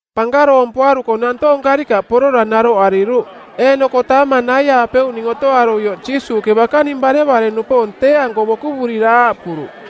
Pankaroompuaruko nantoong karikaꞌ porora naroꞌariruꞌ. Eeꞌnoko taamang naiaapeuꞌning otoaruioꞌ Jiisuuꞌke bakaning barevare-nupoong tee-anko bokuvurira aaꞌpuruꞌ,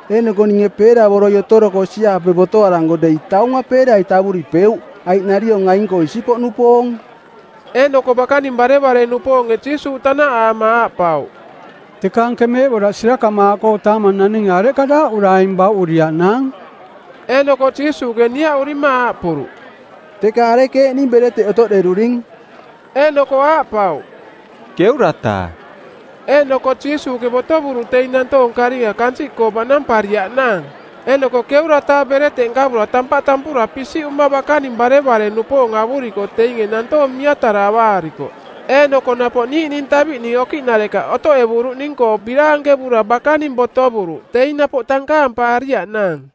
Eeꞌnoko ninge peeravoroi otoroko osi-aape botoaranko dei taunga peerai tavuripeuꞌ, aiꞌ nariong aing-koo isipoꞌnupoong.” Eeꞌnoko bakaning barevare-nupoonge Jiisuuꞌ tanaꞌaama aaꞌpauꞌ, “Teka anke meeꞌboraꞌ sirakamaaꞌkoo taamang naninge areꞌka daaꞌura aing bauꞌuriaꞌnaang?” Eeꞌnoko Jiisuuꞌke niaꞌurima aaꞌpuruꞌ, “Teka arekeeꞌning bereteꞌ otoꞌderuring?” Eeꞌnoko aaꞌpauꞌ, “˜Keura-taa.” Eeꞌnoko Jiisuuꞌke botovuruꞌ teing nantoong karinga kansiꞌkoo baꞌnampariaꞌnaang. Eeꞌnoko ˜keura-taa bereteꞌ nkavura tampaꞌ tampura pisiꞌuma bakaning barevare-nupoong avuriko teinge nantoong miatara avaarikoꞌ. Eeꞌnoko napoꞌ niiꞌning taviꞌning okiꞌnarekaꞌ otoꞌevuruꞌning-koo biraankevura bakaning botovuruꞌ teing napoꞌ tankaampaariaꞌnaang.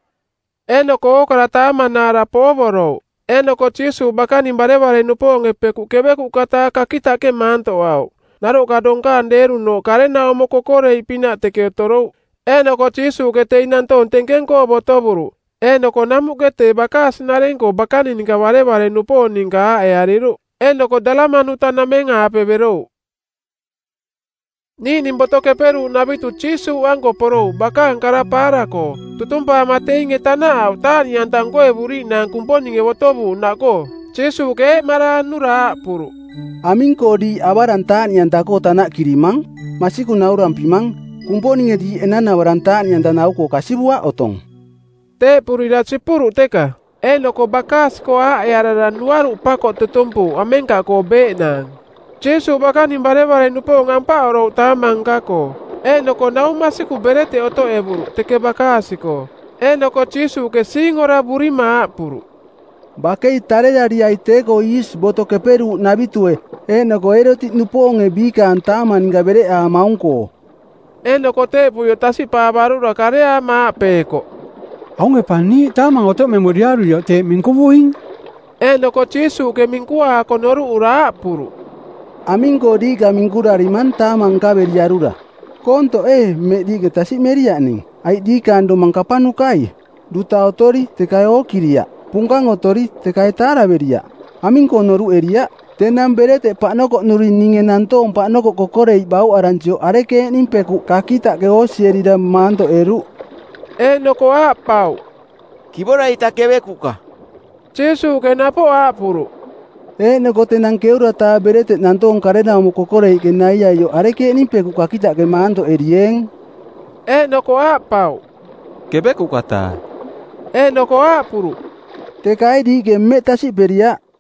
Eeꞌnoko ookara taamanaara poovorouꞌ. Eeꞌnoko Jiisuuꞌ bakaning barevare-nupoonge pekuꞌ ˜kevekuꞌka-taa kakitaꞌke maantoꞌauꞌ. Naroꞌka donkaang deerunooꞌ karenaumo kokoreiꞌ pinaꞌ teke otorouꞌ. Eeꞌnoko Jiisuuꞌke teing nantoong tenkeng-koo botovuruꞌ. Eeꞌnoko namuꞌke tee bakaasi-nareng-koo bakaning barevare-nupoong ninka aaꞌeariruꞌ, eeꞌnoko Dalamanuta-nameng-aape berouꞌ. Niiꞌning Boto Keperuuꞌnavitu Jiisuuꞌanko porouꞌ bakaang kara paara-koo. Tutumpaama teinge tanaꞌauꞌ taaꞌniꞌanta nkoevuriiꞌnaang Kumponinge botovuuꞌnaꞌkoo. Jiisuuꞌke eeꞌmaraanura aaꞌpuruꞌ, “Aming-koo diiꞌ avarang taaꞌniꞌanta-koo tanaꞌkirimang? Masikung naurampimang, Kumponinge diiꞌ enanavarang taaꞌniꞌanta nau-koo kasivuaꞌ otong.” Teeꞌpurira sipuruꞌ teka, eeꞌnoko bakaasi-koo aaꞌearara nuaruꞌ pakoꞌ tutumpuuꞌ amenkaꞌkoo beeꞌnaang. Jiisuuꞌ bakaning barevare-nupoong ampaꞌorouꞌ taamang nka-koo. Eeꞌnoko nau masiku bereteꞌ otoꞌevuruꞌ teke bakaasi-koo. Eeꞌnoko Jiisuuꞌke siingoravurima aaꞌpuruꞌ, “Bakei tarerariai tee-koo iisi Boto Keperuuꞌnavitue eeꞌnoko Eerotiꞌnupoonge biikaang taamang ninka bereꞌaamaung-koo.” Eeꞌnoko teeꞌpuioꞌ tasiꞌpaavarura kareaama aaꞌpeekoꞌ, “Aunge pa niiꞌ taamang otoꞌmemuriaruioꞌ teeꞌ minkuvuing.” Eeꞌnoko Jiisuuꞌke minkuaako noruꞌura aaꞌpuruꞌ, “Aming-koo diiꞌka minkurarimang taamang nkaveriarura? Koontoꞌ ee mmeꞌ diiꞌke tasiꞌmeriaꞌ ning? Aiꞌ diikaang domang kapanukai? Duta otori, teka ee ookiriaꞌ? Punkang otori, teka ee taaraveriaꞌ? Aming-koo noruꞌeriaꞌ? Tenang bereteꞌ paꞌnokoꞌnuri ninge nantoong paꞌnokoꞌ kokoreiꞌ bauꞌaransioꞌ arekeeꞌning pekuꞌ kakitaꞌke oosierira maantoꞌeruꞌ?” Eeꞌnoko aaꞌpauꞌ, “Kivora-ita kevekuꞌka.” Jiisuuꞌke napoꞌ aaꞌpuruꞌ, “Eeꞌnoko tenang ˜keura-taa bereteꞌ nantoong karenaumo kokoreiꞌke naiaioꞌ arekeeꞌning pekuꞌ kakitaꞌke maantoꞌerieeng?” Eeꞌnoko aaꞌpauꞌ, “˜Kevekuꞌka-taa.” Eeꞌnoko aaꞌpuruꞌ, “Teka ee diiꞌke mmeꞌ tasiꞌperiaꞌ?”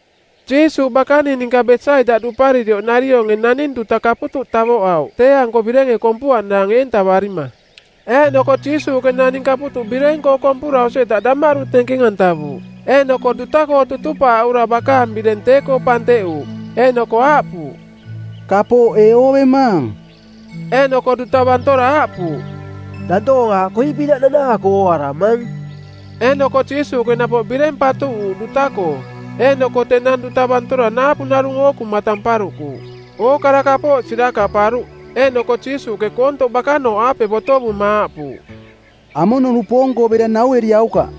Jiisuuꞌ bakaning ninka Besaida duparirioꞌ narionge naning duta kaputuꞌ tavoꞌauꞌ tee-anko birenge kompuaꞌnaang eentavarima. Eeꞌnoko Jiisuuꞌke naning kaputuꞌ bireng-koo kompura osi-eta damaꞌdu tenkeng-antavuuꞌ. Eeꞌnoko duta-koo tutupaaꞌura bakaang bireng tee-koo panteꞌuuꞌ, eeꞌnoko aaꞌpuuꞌ, “Kapooꞌ ee oovemaang?” Eeꞌnoko duta bantora aaꞌpuuꞌ, “Nantoong aaꞌ koiꞌpinaꞌ nanaako ooaramang.” Eeꞌnoko Jiisuuꞌke napoꞌ bireng patuꞌuuꞌ duta-koo, eeꞌnoko tenang duta bantora naapu narung ookuma tamparuꞌkuuꞌ. Ookara kapooꞌ sirakaꞌparuꞌ. Eeꞌnoko Jiisuuꞌke koontoꞌ bakanooꞌaape botovuma aaꞌpuuꞌ, “Amono-nupoong-koo bera naueriaukaꞌ!”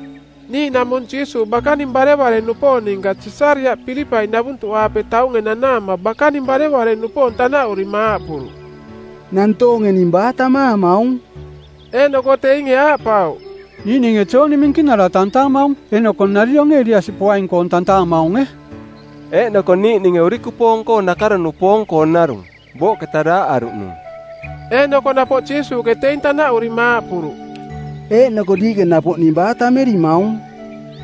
Niiꞌnaꞌmung Jiisuuꞌ bakaning barevare-nupoong ninka Sisariaꞌ Pilipai navuntuꞌaape taunge nanaama bakaning barevare-nupoong tanaꞌurima aaꞌpuruꞌ, “Nantoonge ning baa tammaamaung?” Eeꞌnoko teinge aaꞌpauꞌ, “Niiꞌninge Jooni Minkinara tantaamaung. Eeꞌnoko narionge Eliasi poaing-koong tantaamaunge. Eeꞌnoko niiꞌninge urikupoong nakaro-nupoong-koo narung, booꞌketa daaꞌaruꞌnung.” Eeꞌnoko napoꞌ Jiisuuꞌke teing tanaꞌurima aaꞌpuruꞌ, “Eeꞌnoko diiꞌke napoꞌ ning baa tammerimaung?”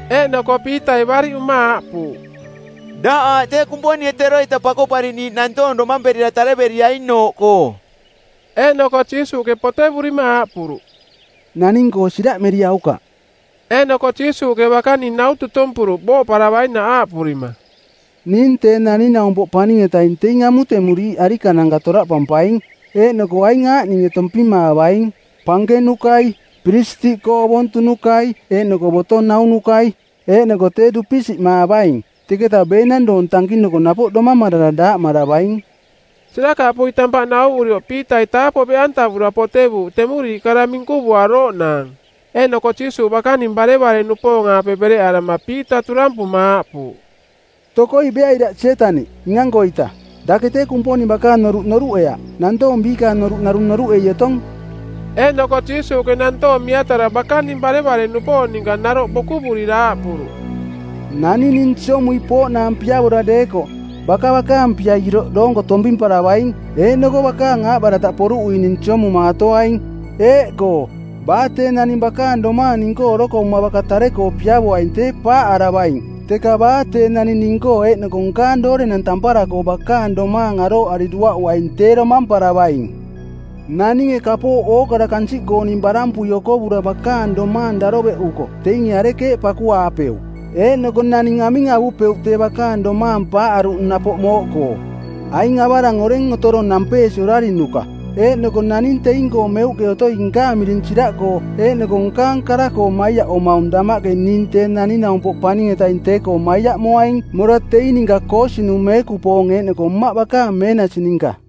Eeꞌnoko Piitai bariꞌuma aaꞌpuuꞌ, “Daꞌ aaꞌ tee Kumponinge teroita Pakoꞌpariꞌniiꞌ nantoong domamperira tareveriainooꞌkoo.” Eeꞌnoko Jiisuuꞌke potevurima aaꞌpuruꞌ, “Naning-koo siraꞌmeriaukaꞌ.” Eeꞌnoko Jiisuuꞌke bakaning nau tutumpuruꞌ booꞌparavainaꞌ, aaꞌpurima, “ning Tee Naning-naumpoꞌ Paning-etaing teing amutemuriiꞌ arikananka toraꞌpampaing, eeꞌnoko aing aaꞌninge tompimaavaing: pankenukai, piristiꞌkoong ovontunukai eeꞌnoko boto naunukai, eeꞌnoko tee dupisiꞌmaavaing. Teketa beenang doong tankinuko napoꞌ domamarara daaꞌmaravaing.” Sirakaꞌpui tampaꞌ nauvurioꞌ Piitai taapoꞌ beꞌantavura potevuuꞌ temuriiꞌ kara minkuvuarooꞌnaang. Eeꞌnoko Jiisuuꞌ bakaning barevare-nupoong-aape bereꞌarama Piita turampuma aaꞌpuuꞌ, “Tokoi beai daꞌ Sietaniꞌ, ning-ankoita. Dake tee Kumponing bakaang noruꞌ noruꞌeaꞌ, nantoong biikaang noruꞌ narung noruꞌei otong.” Eeꞌnoko Jiisuuꞌke nantoong miatara bakaning barevare-nupoong ninka naroꞌ bokuvurira aaꞌpuruꞌ, “Naning ning siomui pooꞌnaang piavora deekoꞌ, baka bakaang pia iroꞌ doonko tompimparavaing eeꞌnoko bakaang aaꞌbarataꞌ poruꞌui ning siomumaatoaing. Eeꞌkoo, baa tee naning bakaang domaang ning-koo orokovuma baka tare-koo piavoaing tee paaꞌaravaing, teka baa tee naning ning-koo eeꞌnoko nkaang doorenang tampara-koo bakaang domaang arooꞌari duaꞌuaing tee domamparavaing. Naninge kapooꞌ ookara kansiꞌkooning barampui okovura bakaang domaang daroveꞌuko teinge arekeeꞌ pakuaapeuꞌ? Eeꞌnoko naning aming avupeuꞌ tee bakaang domaang paaꞌaruꞌnung napoꞌ mooꞌkoo? Aing avarang oreng otorong nampeesi orarinuka, eeꞌnoko naning teing-koo meuꞌke otoi nkaang miring siraꞌkoo eeꞌnoko nkaang kara-koo maiaꞌomaung damaꞌke ning Tee Naning-naumpoꞌ Paning-etaing tee-koo maiaꞌmoaing mora teing ninka koosinung˜ meekupoong eeꞌnoko Mmaꞌ bakaang meenasi ninka.”